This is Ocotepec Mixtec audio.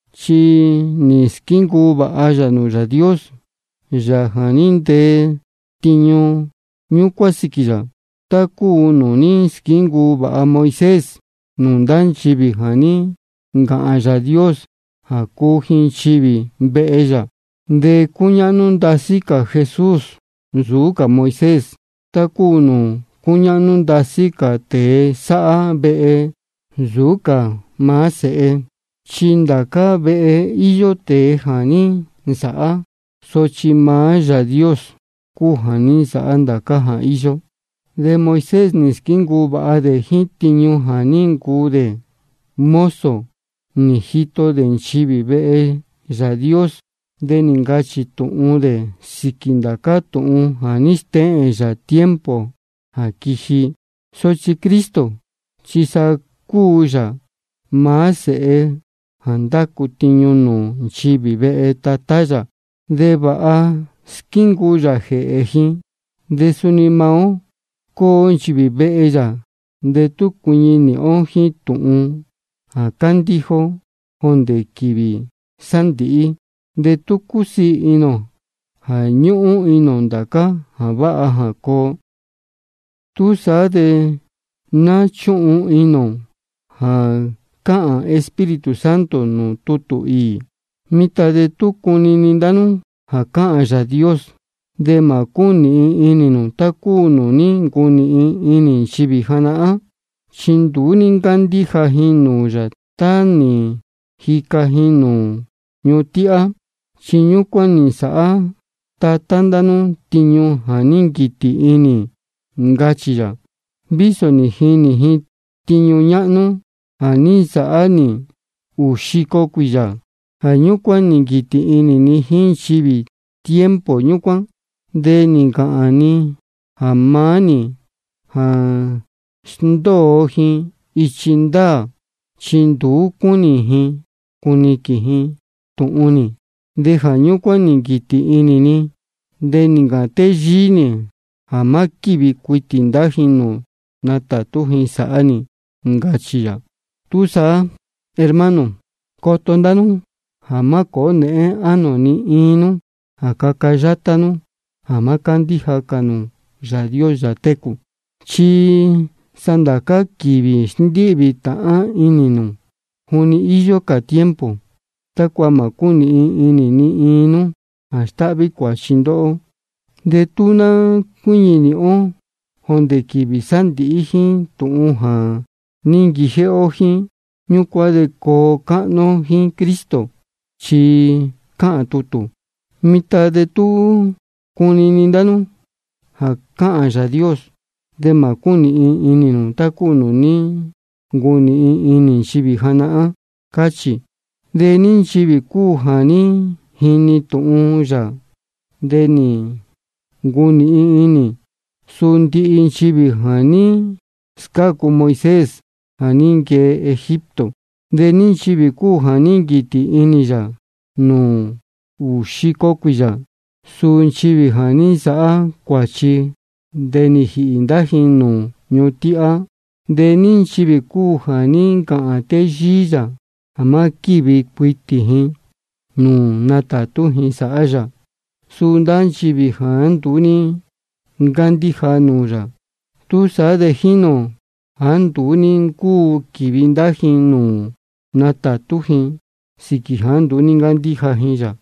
Chi nī squíncuu vāha yā nūū Yāā Dios, Yāā jā ní ntee tiñu ñúcuán sīquī yā, tá cúu nūū ní squíncuu vāha Moisés nūū ndá nchivī jā ní ncāhān Yāā Dios jā cúu ji nchivī vehe yā. De cúñáhnú ndasí cā Jesús nsūú cā Moisés, tá cúu nūū cúñáhnú ndasí cā tēe sáhá vehe nsūú cā maá vehe. Chi ndācá vehe íyó tēe jā ní nsāhá. Sochi maá Yāā Dios cúu jā ní nsāhá ndācá jā íyó. De Moisés nī squíncuu vāha dē jíín tiñu jā ní ncuu dē mozo nī jito dē nchivī vehe Yāā Dios. De nī ncachī tūhun dē sīquī ndācá tūhun jā stéhēn yā tiempo jā quiji. Sochi Cristo chi sa cúu yā maá Sēhe jā ndácu tiñu nūū nchivī vehe Tatá yā, de vāha squíncuu yā jēhē ji. De suni maá ó cúu nchivī vehe yā, de tú cuiñi nīhin ó jíín tūhun jā cándíja ó jondē quīvī sándīhí, de tú cúsiī inī ō jā ñúhún inī ō ndācá jā váha jā coo. Túsaá de ná chúhun inī ō jā cáhān Espíritu Santo nūū tutū īī: Mitan de tú cunini ndá nú jā cáhān Yāā Dios, de mā cúnīhin inī nū tá cúu nūū ní ncunīhin inī nchivī janahán. Chi nduú ní ncándíja ji nūū yā tá nī jica ji nūū ñuhun tíhá. Chi ñúcuán nī nsāhá tatā ndá nú tiñu jā ní nquītī inī ni, ncachī yā, vísō nī jinī ji tiñu ñáhnú jā ní nsāhá nī ūū xico cuīyā. Jā ñúcuán nī nquītī inī ni jíín nchivī tiempo ñúcuán. De nī ncāhān ni jā maá-ni jā sndóo ji ichi ndaā, chi nduú cúnī ji cuniquīn ji tūhun nī. De jā ñúcuán nī nquītī inī ni, de nī ncāhān téyíí nī jā má quívi cuitī ndá ji nūū natātú ji sāhá nī. Ncachī yā. Túsaá, hermano, coto ndá nú jā má cōó nēhén ánō ni iin nú jā caca yátá nú jā má cándíja cā nū Yāā Dios, Yāā técū. Chi sa ndācá quīvī sndíhvī tāhán inī nū, juni íyó cā tiempo, tácua mā cúnīhin inī ni iin nú jā stáhví cuāchi ndóhó. De tú ná cuíñi nīhin ó jondē quīvī sándīhí jíín tūhun jā ní nquijéhé ó jíín, ñúcuán de coo cáhnú ó jíín Cristo. Chi cáhān tutū: Mitan de tú cunini ndá nú jā cáhān Yāā Dios, de mā cúnīhin inī nū tá cúu nūū ní ncunīhin inī nchivī janahán. Cáchī. ¿De ní nchivī cúu jā ní jini tūhun yā de nī ncunīhin inī? Suu ndihi nchivī jā ní scácu Moisés jā ní nquee Egipto. ¿De ní nchivī cúu jā ní nquītī inī yā nūū ūū xico cuīyā? Suu nchivī jā ní nsāhá cuāchi de nī jīhī ndá ji nūū ñuhun tíhá. ¿De ní nchivī cúu jā ní ncāhān téyíí yā jā má quívi cuitī ji nūū natātú ji sāhá yā? Suu ndá nchivī jāá nduú ní ncándíja nūū yā. Túsaá de jínī ō jāá nduú ní ncúu quīvi ndá ji nūū natātú ji, sīquī jāá nduú ní ncándíja ji yā.